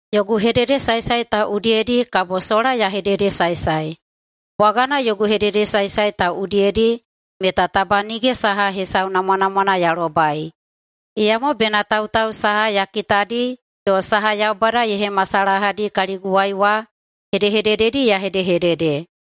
Yogu hededesaesae ta udiyedi kabo sola ya hededesaesae. Bwagana yogu hededesaesae ta udiyedi meta taba nige saha hesau namwanamwana ya lobai, iyamo bena tautau saha ya kitadi yo saha Yaubada ye hemasalahadi kaliguwai wa hedehedededi ya hedehedede.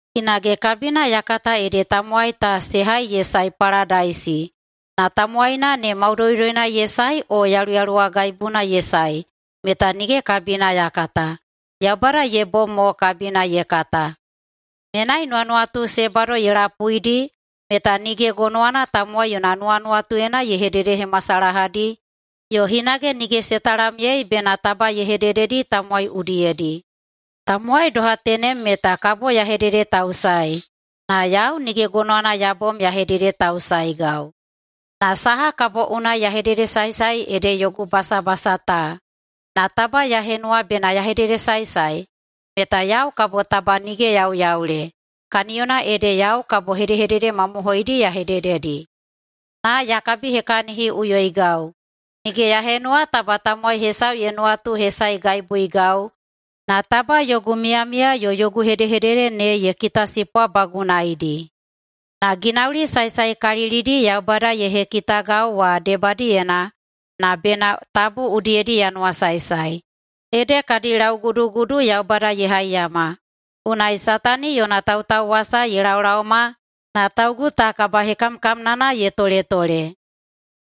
Hinage kabina ya kata ede tamowai ta se hai ye sae paladaisi, na tamowaina ne maudoudoina ye sae o yaluyaluwagaibuna ye sae meta nige kabina ya kata, Yaubada ye bom mo kabina ye kata. Menai nuwanuwatu se bado ye lapuidi meta nige gonowana tamowai yona nuwanuwatuyena ye hededehemahemasalahadi yo hinage nige se talamyei bena taba ye hedededi tamowai udiyedi. Tamowai doha tenem meta kabo ya hededetausaei, na yau nige gonowana ya bom ya hededetausaeigau. Na saha kabo unai ya hededesaesae ede yogu basabasa ta. Na taba ya henuwa bena ya hededesaesae meta yau kabo taba nige yauyaule, kaniyona ede yau kabo hedehedede mamohoidi ya hedededi. Na ya kabihekahiniꞌuyoigau. Nige ya henuwa taba tamowai hesau ye nuwatuhesaegaibuigau, na taba yogu miyamiya yo yogu hedehedede ne ye kitasipwabagunaidi. Na ginauli saesaekalilidi Yaubada ye hekitagau wa debadiyena na bena tabu udiyedi ya nuwasaesae, ede kadi laugudugudu Yaubada ye haiyama, unai Satani yona tautauwasa ye laolaoma na taugu ta kabahekamkamnana ye toletole.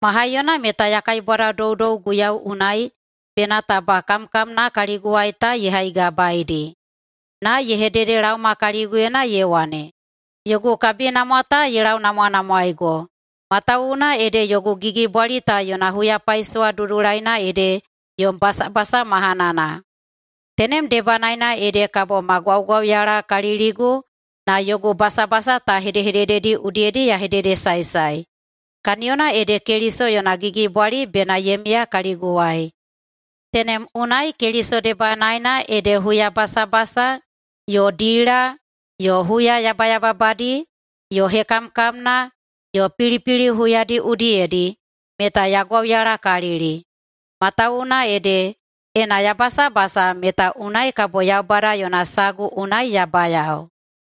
Ma haiyona meta ya kaibwadadoudou Guiyau unai bena taba kamkamna kaliguwai ta ye haigabaeidi. Na ye hededelaoma kaliguyena ye wane, “Yogu kabinamwa ta ye launamwanamwaeigo. Matawuwuna ede yogu gigibwali ta yona huyapaisowa dudulaina ede yom basabasa mahanana.” Tenem debanaena ede kabo ma gwaugwauyalakaliligu na yogu basabasa ta hedehedededi udiyedi ya hededesaesae. Kaniyona ede Keliso yona gigibwali bena ye miya kaliguwai. Tenem unai Keliso debanaena ede huyabasabasa yo dila yo huya yabayababadi, yo hekamkamna yo pilipili huyadi udiyedi meta ya gwauyalakalili. Matawuwuna ede, ena ya basabasa meta unai kabo Yaubada yona sagu unai ya bayao.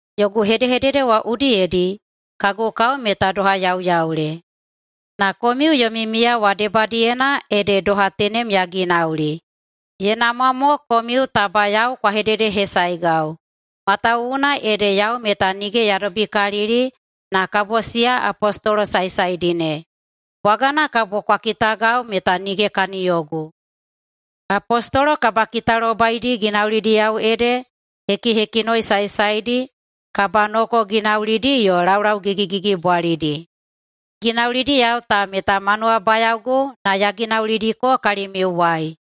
Yogu hedehedede wa udiyedi kagu kao meta doha yauyaule, na komiu yomi miya wa debadiyena ede doha tenem ya ginauli. Ye namwa mo komiu taba yau kwa hededehesaegau, matawuwuna ede yau meta nige ya dobikalili na kabo siya apostolo saesaedi ne, bwagana kabo kwa kitagau meta nige kaniyogu. Apostolo kabakitalobaidi ginaulidiyao ede hekihekinoi saesaedi, kabanoko ginaulidi yo laulau gigigigibwalidi. Ginaulidiyao ta meta ma nuwabayaogu na ya ginaulidiko kalimiuwai.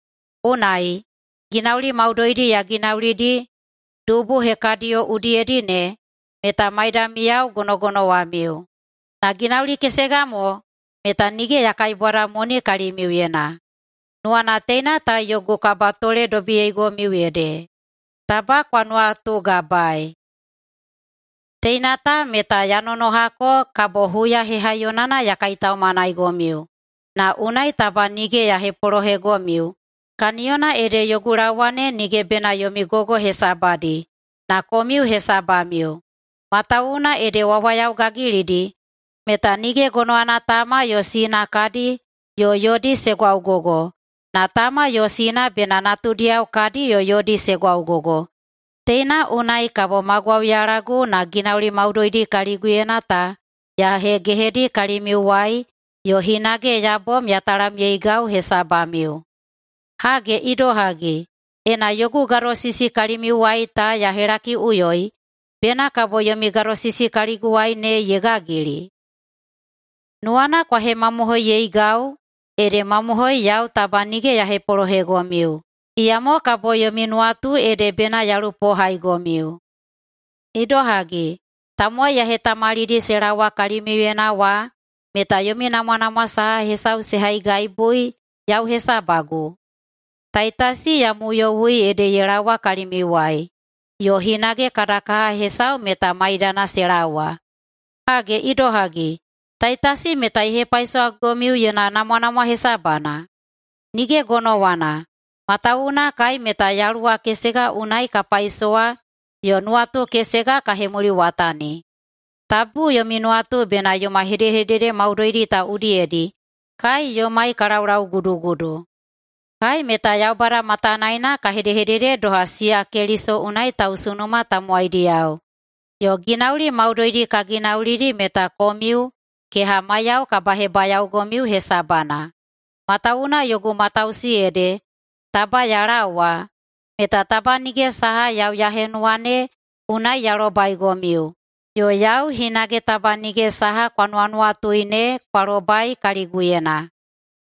Unai, Ginauli maudoidi ya ginaulidi dubu hekadiyo udiyedi ne meta maidamiyao gonogonowamiu. Na ginauli kesega mo, meta nige ya kaibwadamoni kalimiuyena. Nuwana teina ta yogu kabatoledobiyeigomiu ede, taba kwa nuwatugabaei. Teina ta meta ya nonohako kabo huya hehaiyonana ya kaitaumanaigomiu, na unai taba nige ya hepolohegomiu, kaniyona ede yogu laowa ne nige bena yomi gogo hesabadi, na komiu hesabamiu. Matawuwuna ede wawayao gagilidi meta nige gonowana tama yo sina kadi yo yodi se gwaugogo, na tama yo sina bena natudiyao kadi yo yodi se gwaugogo. Teina unai kabo ma gwauyalagu na ginauli maudoidi kaliguyena ta ya hegehedi kalimiuwai yo hinage ya bom ya talamyeigau hesabamiu. Hage idohagi, ena yogu gadosisi kalimiuwai ta ya helakiꞌuyoi, bena kabo yomi gadosisi kaliguwai ne ye gagili? Nuwana kwa hemamohoiyeigau ede mamohoi yau taba nige ya hepolohegomiu, iyamo kabo yomi nuwatu ede bena ya lupohaigomiu. Idohagi, tamowai ya hetamalidi se laowa kalimiuyena wa meta yomi namwanamwa saha hesau se haigaibui yau hesabagu? Taitasi ya muyowui ede ye laowa kalimiuwai, yo hinage kada kaha hesau meta maidana se laowa. Hage idohagi, Taitasi meta ye hepaisowagomiu yona namwanamwa hesabana? Nige gonowana, matawuwuna kai meta yaluwa kesega unai ka paisowa yo nuwatu kesega ka hemuliwatani. Tabu yomi nuwatu bena yoma hedehedede maudoidi ta udiyedi kai yomai ka laulaugudugudu. Kai meta Yaubada matanaena ka hedehedede doha siya Keliso unai tausunuma tamowaidiyao, yo ginauli maudoidi ka ginaulidi meta komiu, kehamaiyao, kabahebayaogomiu hesabana. Matawuwuna yogu matausi ede taba ya laowa meta taba nige saha yau ya henuwa ne unai ya lobaigomiu, yo yau hinage taba nige saha kwa nuwanuwatui ne kwa lobai kaliguyena.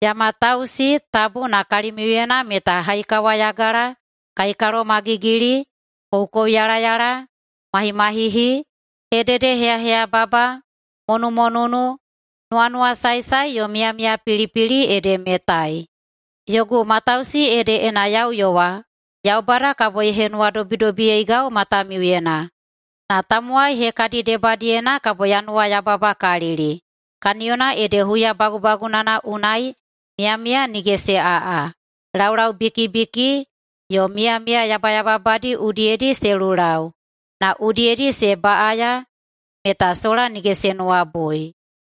Ya matausi tabu na kalimiuyena meta haikawayagala, kaikalomagigili, koukouyalayala, mahimahihi, hededeheyaheyababa, monumonunu, nuwanuwasaesae yo miyamiyapilipili ede metai. Yogu matausi ede ena ya uyowa, Yaubada kabo ye henuwadobidobiyeigau matamiuyena, na tamowai hekadi debadiyena kabo ya nuwayababakalili, kaniyona ede huya bagubagunana unai miyamiya nige se aꞌa, laulau bikibikidi yo miyamiya yabayababadi udiyedi se lulau na udiyedi se baꞌaya meta sola nige se nuwabui.